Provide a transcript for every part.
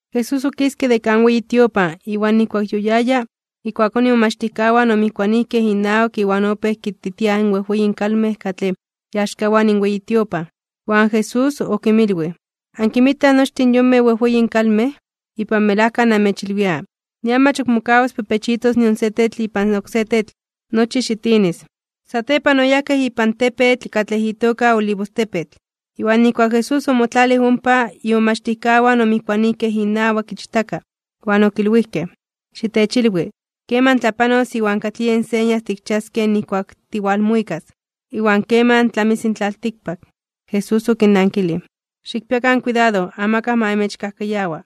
Jesús okiske de kan weyi tiopan, iwan nijkuak yoyaya, ijkuakón imomachtijkawan omijkuanijkej inawak iwan opéj kititiaj in wejweyin kalmej katlej iaxkawan in weyi tiopan. Iwan Jesús okinmilwij: ―¿Ankinmitaj nochtin in yonmej wejweyin kalmej? Ipan melajka namechilwia, nian mach ok mokawas pepechitos nion se tetl ipan oksé tetl, nochi xitinis. Satepan oyajkej ipan tepetl katlej itoka Olivostepetl. Iwan nijkuak Jesús omotlalij ompa, imomachtijkawan omijkuanijkej inawak ichtaka, iwan okilwijkej: ―Xitechilwi, ¿keman tlapanos iwan katlij yen señas tikchiaskej nijkuak tiwalmuikas? ¿Iwan keman tlamis in tlaltikpak? Jesús okinnankilij: ―Xikpiakan kuidado, amakaj ma amechkajkayawa.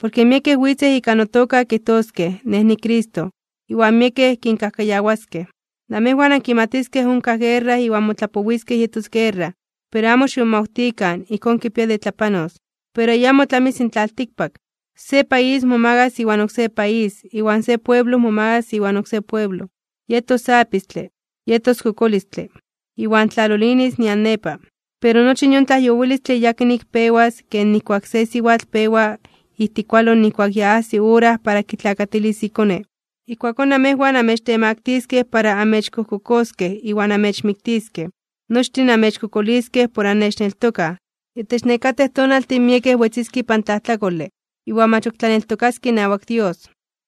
Porke miekej witzej ika notoka kijtoskej: “Nej niCristo”. Iwan miekej kinkajkayawaskej. Namejwan ankimatiskej onkaj guerra iwan motlapowiskej yetos guerra, pero amo ximomawtikan, ijkón kipia de tlapanos. Pero ayamo tlamis in tlaltikpak. Se país momagas iwan oksé país, iwan se pueblo momagas iwan oksé pueblo. Yetos apistle, yetos kokolistle, iwan tlalolinis nian nepa. Pero nochi yon tlajyowilistle yakin ik pewas ken nijkuak se siwatl pewa ijtikualo nijkuak ya ajsi ora kitlakatilis ikone. ’Ijkuakón namejwan amechtemaktiskej (omechtemaktiliskej) para amechkojkokoskej iwan amechmiktiskej. Nochtin amechkokoliskej por annechneltokaj. Itech nekatej tonaltin miekej wetziskej ipan tlajtlakole iwan mach ok tlaneltokaskej inawak Dios,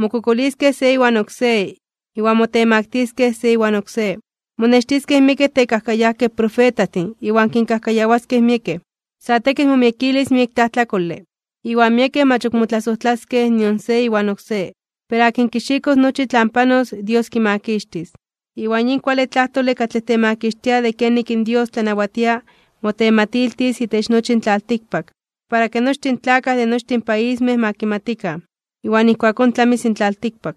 mokokoliskej se iwan oksé, iwan motemaktiskej se iwan oksé. Monextiskej miekej tekajkayajkej profetajtin, iwan kinkajkayawaskej miekej. Sa tekitl momiekilis miek tlajtlakole, iwan miekej mach ok motlasojtlaskej nion se iwan oksé. Pero akin kixikos nochi tlan panos, Dios kimakixtis. Iwan yin kuale tlajtole katlej temakixtia de kenik in Dios tlanawatia, motematiltis itech nochi in tlaltikpak, para ke nochtin in tlakaj de nochtin paismej ma kimatikan. Iwan ijkuakón tlamis in tlaltikpak.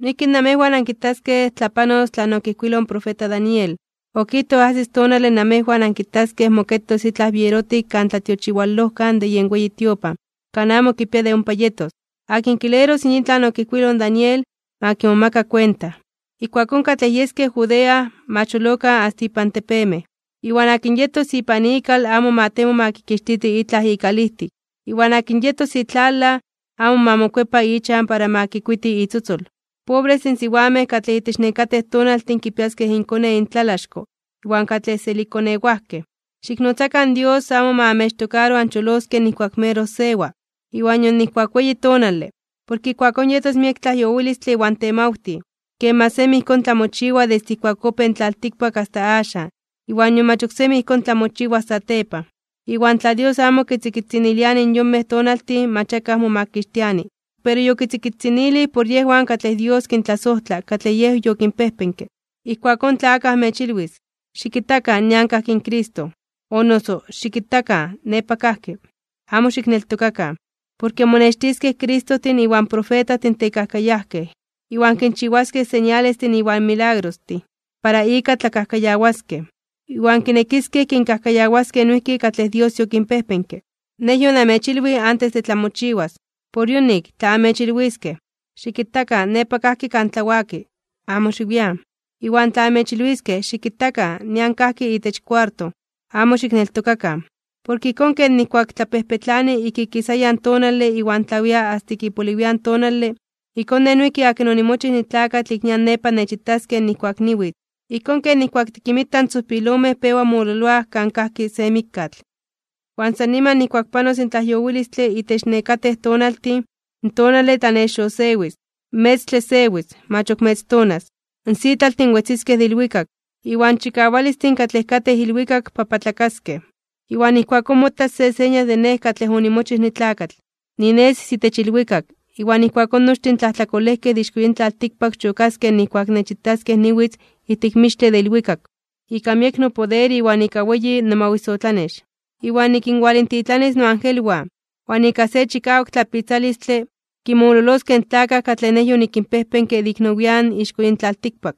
’Noijki namejwan ankitaskej tlapanos tlan okijkuiloj in profeta Daniel, okijtoj ajsis tonale namejwan ankitaskej moketos itlaj bierotik Kan Tlatiochiwalojkan de yen weyi tiopan kan amo kipia de ompa yetos ―akin kileros yin tlan okijkuiloj in Daniel, ma kimomaka kuenta―, ijkuakón katlej yeskej Judea, ma cholokan asta inpan tepemej. Iwan akin yetos ipan ikal amo ma temo ma kixtiti itlaj ikalijtik. Iwan akin yetos itlalaj, amo ma mokuepa ichan para ma kikuiti itzotzol. ¡Pobrestin siwamej katlej itech nekatej tonaltin kipiaskej inkone intlalaxko iwan katlej selikkonewajkej! Xiknotzakan Dios amo ma amechtokaro ancholoskej nijkuak meroj sewa, iwan nion nijkuak weyi tonale. Porke ijkuakón yetos miek tlajyowilistle iwan temawtij, ken mach semi ijkón tlamochiwa desde ijkuak opéj in tlaltikpak asta axan, iwan nion mach oksemi ijkón tlamochiwas satepan. Iwan tla Dios amo kitzikitziniliani in yonmej tonaltin mach akaj momakixtiani. Pero yokitzikitzinilij por yejwan katlej Dios kintlasojtla katlej Yej yokinpejpenke. ’Ijkuakón, tla akaj amechilwis: “Xikitakan, nian kajki in Cristo”, o noso “Xikitakan, nepa kajki”, amo xikneltokakan. Porke monextiskej Cristojtin iwan profetajtin tekajkayajkej, iwan kinchiwaskej señalestin iwan milagrostin, para ika tlakajkayawaskej, iwan kinekiskej kinkajkayawaskej noijki katlej Dios yokinpejpenke. Nej yonamechilwij antes de tlamochiwas. Por yonik, tla amechilwiskej: “Xikitakan, nepa kajki kan tlawaki”, amo xiwian. Iwan tla amechilwiskej: “Xikitakan, nian kajki itech kuarto”, amo xikneltokakan. Porke ijkón ken ijkuak tlapejpetlani ik ikisayan tonale iwan tlawia asta ik ipoliwian tonale, ijkón Nej noijki akin onimochij nitlakatl ik nian nepa nechitaskej nijkuak niwitz. Ijkón ken nijkuak tikinmitaj in tzojpilomej pewa mololoaj kan kajki se mikkatl. ’Iwan san niman nijkuak panos in tlajyowilistle itech nekatej tonaltin, in tonale tlanexosewis, in metztle sewis, mach ok metztonas, in sitlaltin wetziskej de ilwikak, iwan chikawalistin katlej katej ilwikak papatlakaskej (bibiokaskej). Iwan ijkuakón motas se señal de Nej katlej onimochij nitlakatl, ninesis itech ilwikak, iwan ijkuakón nochtin in tlajtlakolejkej de ixko yin tlaltikpak chokaskej nijkuak nechitaskej niwitz ijtik mixtle de ilwikak, ika miek nopoder iwan ika weyi nomawisotlanex. Iwan nikinwalintitlanis noangelwan, iwan ika se chikawak tlapitzalistle, kinmololoskej in tlakaj katlej Nej yonikinpejpenke de ik nowian (nian nepa) ixko yin tlaltikpak.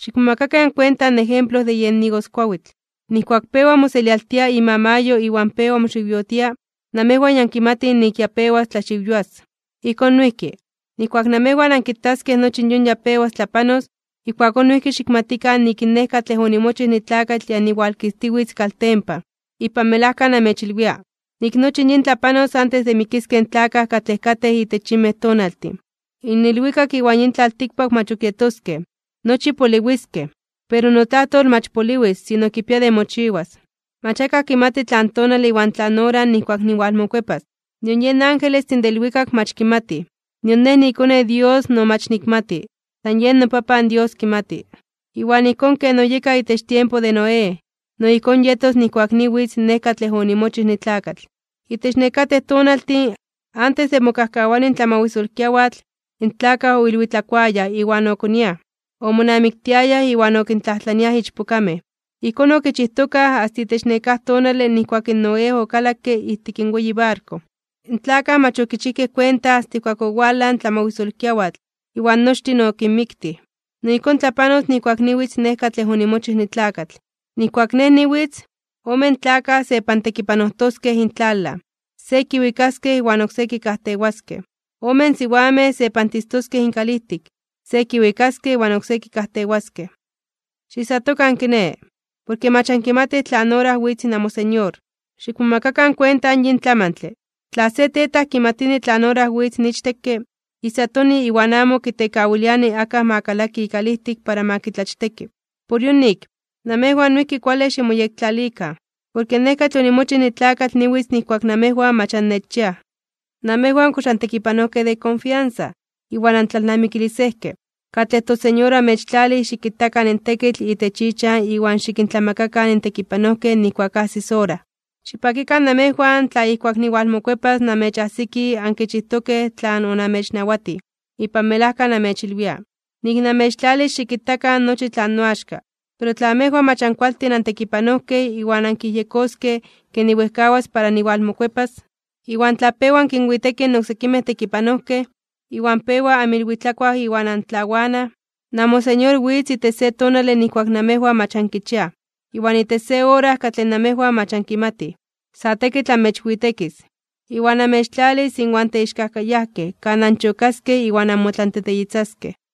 ’Xikmomakakan kuenta in ejemplo de yen igoskuawitl: Nijkuak pewa moselialtia imamayo iwan pewa moxiwyotia, namejwan ya ankimatij nik ya pewas tlaxiwyoas. Ijkón noijki, nijkuak namejwan ankitaskej nochi in yon ya pewas tlapanos, ijkuakón noijki xikmatikan nik in Nej katlej onimochij nitlakatl ya niwalkistiwitz kaltempan. Ipan melajka namechilwia, nik nochi in yin tlapanos antes de mikiskej in tlakaj katlej katej itech yinmej tonaltin. In ilwikak iwan yin tlaltikpak mach ok yetoskej, nochi poliwiskej, pero notlajtol mach poliwis, sino kipia de mochiwas. ’Mach akaj kimati tlan tonale iwan tlan ora nijkuak niwalmokuepas, nion yen angelestin de ilwikak mach kimatij, nion Nej niiKone in Dios no mach nikmati, san yen noPapan Dios kimati. ’Iwan ijkón ken oyeka itech tiempo de Noé, no ijkón yetos nijkuak niwitz Nej katlej onimochij nitlakatl. Itech nekatej tonaltin, antes de mokajkawani in tlamawisolkiawatl, in tlakaj oilwitlakuayaj iwan okoniaj, omonamiktiayaj iwan okintlajtlaniaj ichpokamej. Ijkón okichijtokaj asta itech nekáj tonale nijkuak in Noé okalakke ijtik in weyi barko. In tlakaj mach okichijkej kuenta asta ijkuak owalaj in tlamawisolkiawatl iwan nochtin okinmiktij. No ijkón tlapanos nijkuak niwitz Nej katlej onimochij nitlakatl. Nijkuak Nej niwitz, omen tlakaj sepantekipanojtoskej intlalaj. Se kiwikaskej iwan oksé kikajtewaskej. Omen siwamej sepantistoskej inkalijtik. Se kiwikaskej iwan oksé kikajtewaskej. ’Xiijsatokan, kiné, porke mach ankimatij tlan ora witz namoSeñor. Xikmomakakan kuenta yin tlamantle, tla se tetaj kimatini tlan ora witz in ichtekke, ijsatoni iwan amo kitekawiliani akaj ma kalaki ikalijtik para ma kitlachteki. Por yonik, namejwan noijki kuale ximoyektlalikan. Porke Nej katlej onimochij nitlakatl niwitz nijkuak namejwan mach annechchiaj. ’¿Namejwan kox antekipanojkej de konfiansa iwan antlalnamikilisejkej, katlej toSeñor oamechtlalij xikitakan in tekitl itech ichan iwan xikintlamakakan in tekipanojkej nijkuak ajsis ora? Xipakikan namejwan tla ijkuak niwalmokuepas namechajsiki ankichijtokej tlan onamechnawatij. Ipan melajka namechilwia, nik namechtlalis xikitakan nochi tlan noaxka. Pero tla amejwan mach ankualtin antekipanojkej iwan ankiyejyekoskej ke niwejkawas para niwalmokuepas, iwan tla pewa ankinwitekij in oksekimej tekipanojkej, iwan pewa anmiilwitlakuaj iwan antlawanaj, namoSeñor witz itech se tonale nijkuak namejwan mach ankichiaj, iwan itech se ora katlej namejwan mach ankimatij. Sa tekitl amechwitekis, iwan amechtlalis inwan teixkajkayajkej kan anchokaskej iwan anmotlanteteyitzaskej.